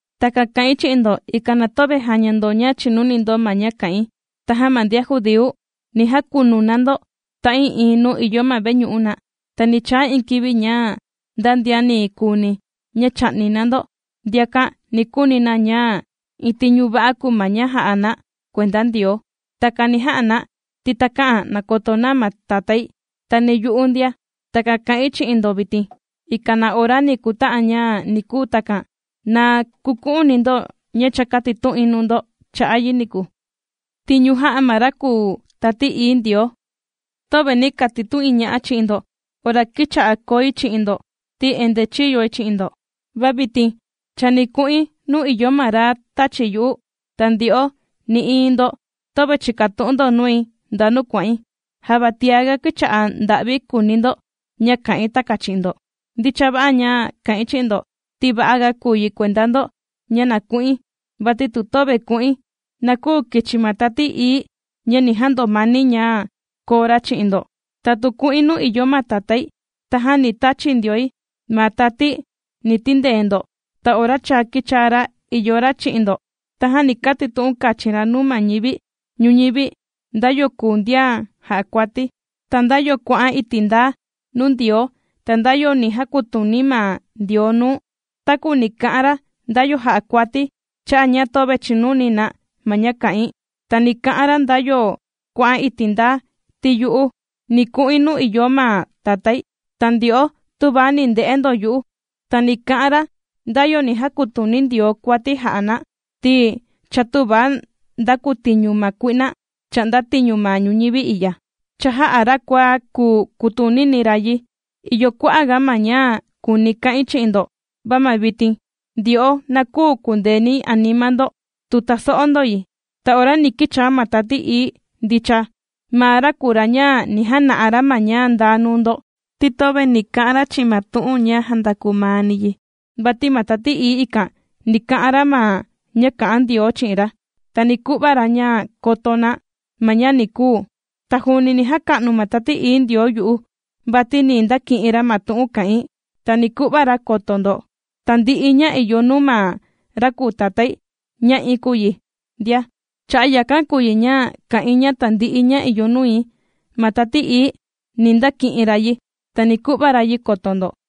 ’Takan kà'in chi'in ndo, ikan na töve jaña ndo ña chìnuni ndo ma ña kà'in. Tajan ma ndian judíu, ni jakunu na ndo ta'ii'iin nuu ìyo ma veñu'u na. Ta ni chaa iin kivi ña nda ndian ni kuuni ña chà'ni na ndo, ndiakan ni kuuni na ña iin tiñu va'a kùu ma ña jà'a na kuenda Ndioo. Takan ni ja'a na, ti takä'an nakoto na ma Tatái, ta ni yu'u ndia. Takan kà'in chi'in ndo vitin, ikan ma ora ni kuta'an ña ni kuu takan, na kuku'uni ndo ña cha kātitu'in nuu ndo cha'a' yi niku. Tiñu jà'a ma ra kùu Tati Ií Ndioo ’Töve nī katitu'in ña'a chi'in ndo ora kīcha'a koi chi'in ndo ti endee chīyoi chi'in ndo. ’Va vitin chani ku'in nuu ìyo ma ra tāchi yu'u, ta ndyo'o nï'iin ndo töve chìkatu'un ndo nui ndanu kuà'in. Java tiaga kīcha'a nda'vi kùuni ndo ña kà'in takan chi'in ndo. Ndicha va'a ña kà'in chi'in ndo, ti va'a ga kùu yi kuenda ndo ña na ku'in, vati tu töve ku'in, na küu kichi ma Tati Ií ña ni jandomani ña kòo ra chi'in ndo. Ta tu ku'in nuu ìyo ma Tatái, tajan ni tachi ndioi ma Tati ni tindee ndo. Ta ora cha kīchaa ra ìyo ra chi'in ndo, tajan ni katitu'un kachin ra nuu ma ñivi ñuñivi nda yo kùu ndian jà'a kuati, ta nda yo kuà'an iti' ndaa nuu Ndioo, ta nda yo ni jakutuni ma Ndioo nuu. Takua ni ka'an ra nda yo jà'a kuati, cha'a' ña töve chìnuni na ma ña kà'in. Ta ni ka'an ra nda yo kuà'an iti' ndaa, ti yu'u ni ku'in nuu ìyo ma Tatái, ta ndyo'o tüva ni nde'e ndo yu'u. Ta ni ka'an ra nda yo ni jakutuni Ndioo kuati jà'a na, ti cha tüva ndakutiñu ma kui'na chà'nda tiñu ma ñuñivi i'ya. Cha jā'a ra kua kuu kùtunini ra yi. ’Ìyo kua'a' ga ma ña kùuni̱ ka'in chi'in ndo, va ma vitin, ndyo'o na küu kundeeni anima ndo tu taso'o ndo yi. Ta ora ni kichaa ma Tati Ií ndicha, maa ra kùu ra ña ni jana'a ra ma ña ndaa nuu ndo, ti töve ni ka'an ra chi'in ma tu'un ña jàndakuu maani yi; vati ma Tati Ií ikan ni ka'an ra ma ña kā'an Ndioo chi'in ra, ta ni ku'va ra ña koto na ma ña ni kuu. Ta juuni ni jaka'nu ma Tati Ií Ndioo yu'u, vati ni ndaki'in ra ma tu'un kà'in, ta ni ku'va ra koto ndo. Tandi'i ña ìyo nuu ma ra kùu Tatái, ña'i kùu yi ndia. Cha'a' yakan kùu yi ña kā'in ña tandi'i ña ìyo nui, ma Tati Ií, ni ndaki'in ra yi, ta ni ku'va ra yi koto ndo.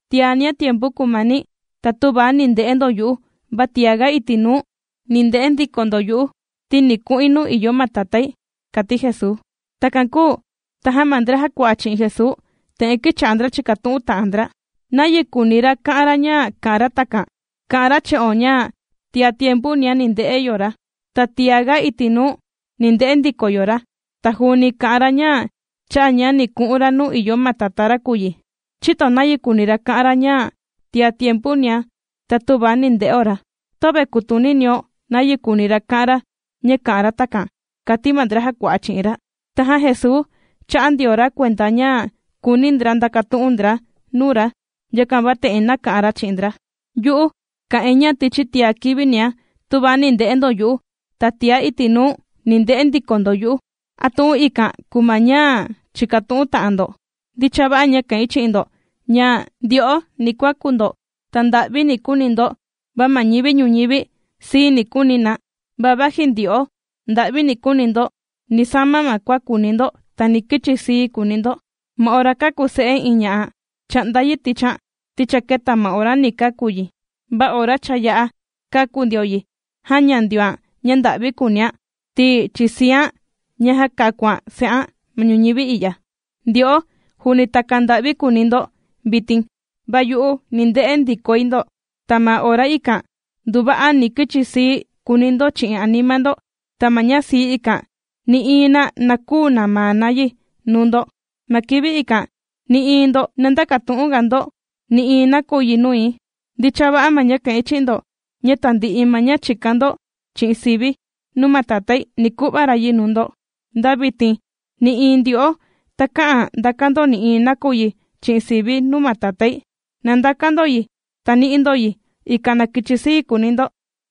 ’Tiania tiempu kùmani, ta tüva ni nde'e ndo yu'u, va tiaga iti' nuu ni nde'e ndiko ndo yu'u, ti ni ku'in nuu ìyo ma Tatái ―kàti Jesuu. Takan kūu, tajan ma ndra jàkua'a chi'in Jesuu, te'en kīcha'a ndra chìkatu'un ta'an ndra: ―¿Nayi kùuni ra ka'an ra ña kà'an ra takan? Kà'an ra chi'o ña tia tiempunia ni nde'o ra, ta tiaga iti' nuu, ni nde'e ndiko yo ra. Ta juuni kà'an ra ña cha'a' ña ni ku'un ra nuu ìyo ma Tatá ra kùu yi. ¿Chïto nayi kùuni ra ka'an ra ña, “tia tiempunia, ta tüva ni nde'o ra”? Töve kùtuninio nayi kùuni ra ka'an ra ña kà'an ra takan ―kàti ma ndra jàkua'a chi'in ra. Tajan Jesuu chā'a ndio ra kuenda ña kùuni ndra ndakatu'un ndra nuu ra, yakan va te'en nāka'an ra chi'in ndra: ―Yu'u kā'in, ña tichi tia kivinia, tüva ni nde'e ndo yu'u, ta tia iti' nuu, ni nde'e ndiko ndo yu'u. ¿A tu'un ikan kùu ma ña chìkatu'un ta'an ndo? Ndicha va'a ña kà'in chi'in ndo ña, ndyo'o ni kuaku ndo, ta nda'vi ni kuuni ndo, va ma ñivi ñuñivi, sii ni kuuni na. Va vaji ndyo'o nda'vi ni kuuni ndo, ni sama ma kua kùuni ndo, ta ni kichi sii kuuni ndo. Ma ora kàku se'e iin ña'a, chà'nda yi tichian, ti cha keta ma ora ni kàku yi. Va ora cha yā'a kāku ndio yi, jàña ndioan ña nda'vi kuunian, ti chisian, ña jākakuan se'an ma ñuñivi i'ya. Ndyo'o, juuni takan nda'vi kùuni ndo vitin, va yu'u ni nde'e ndikoi ndo, ta ma ora ikan nduva'a ni kichi sii kuuni ndo chi'in anima ndo. Ta ma ña sii ikan, nï'iin na na küu namaa na yi nuu ndo. Ma kivi ikan, nï'iin ndo na ndäkatu'un ga ndo nï'iin nakuyi nui. Ndicha va'a ña kà'in chi'in ndo, ña tandi'i ma ña chìkan ndo chi'in sivi̱ nuu ma Tatái, ni ku'va ra yi nuu ndo. Nda vitin nï'iin ndyo'o takä'an ndakan ndo nï'iin nakuyi chi'in sivi̱ nuu ma Tatái. Na ndakan ndo yi, ta ni'i ndo yi, ikan na kichi sii kuuni ndo.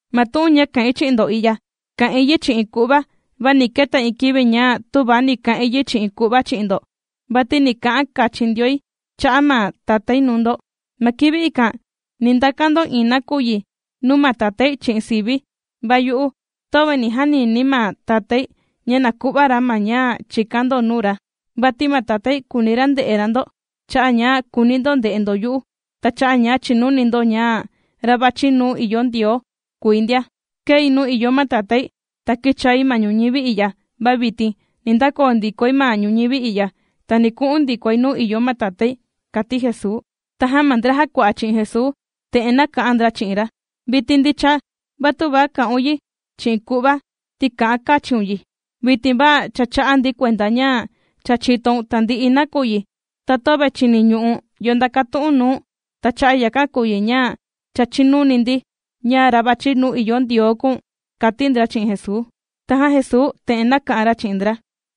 ’Ma tu'un ña kā'in chi'in ndo i'ya, kà'in yi chi'in ku'va. Va ni keta iin kivi ña tüva ni ka'in yi chi'in ku'va chi'in ndo. Vati ni ka'an kachin ndioi cha'a' ma Tatái nuu ndo. Ma kivi ikan ni ndakan ndo iin nakuyi nuu ma Tatái chi'in sivi̱. Va yu'u töve ni janini̱ ma Tatái ña na ku'va ra ma ña chìkan ndo nuu ra. Vati ma Tatái kùuni ra nde'e ra ndo, cha'a' ña kùuni ndo nde'e ndo yu'u, ta cha'a' ña chìnuni ndo ña ra vàchi nuu ìyo Ndioo kùi ndia. Kēi nuu ìyo ma Tatái, ta kīchai ma ñuñivi i'ya. Va vitin ni ndakoo ndikoi ma ñuñivi i'ya, ta ni ku'un ndikoi nuu ìyo ma Tatái ―kàti Jesuu. Tajan ma ndra jàkua'a chi'in Jesuu, te'en nāka'an ndra chi'in ra: ―Vitin ndicha, va tüva kà'un yi chi'in ku'va, ti kà'an kachiun yi. Vitin va cha chà'a ndi kuenda ña cha chìtoun tandi'i nakuyi, ta töve chìniñu'u̱n yo ndakatu'un nuu̱n. Ta cha'a' yakan kùu yi ña cha chìnuni ndi ña ra vàchi nuu ìyo Ndioo kùu̱n ―kàti ndra chi'in Jesuu. Tajan Jesuu te'en nāka'an ra chi'in ndra: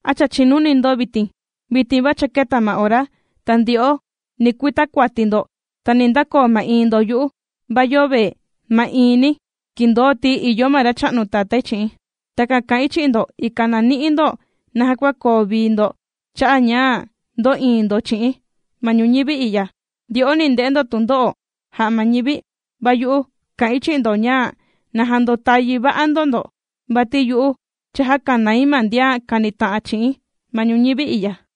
―¿A cha chìnuni ndo vitin? Vitin va cha kēta ma ora, ta ndyo'o ni kuita kuati ndo, ta ni ndakoo ma'iin ndo yu'u. Va yöve ma'iini̱, kìndoo, ti ìyo ma Racha'nu Tatái chi'i̱n. Takan kà'in chi'in ndo, ikan na ni'i ndo naja kua koo vii ndo cha'a' ña ndò'iin ndo chi'i̱n. Ma ñuñivi i'ya, ndyo'o ni nde'e ndo tundo'o jà'a ma ñivi, va yu'u kà'in chi'in ndo ña na jandotayi va'a ndo ndo, vati yu'u cha jākanai ma ndian kànita'an chi'i̱n ma ñuñivi i'ya.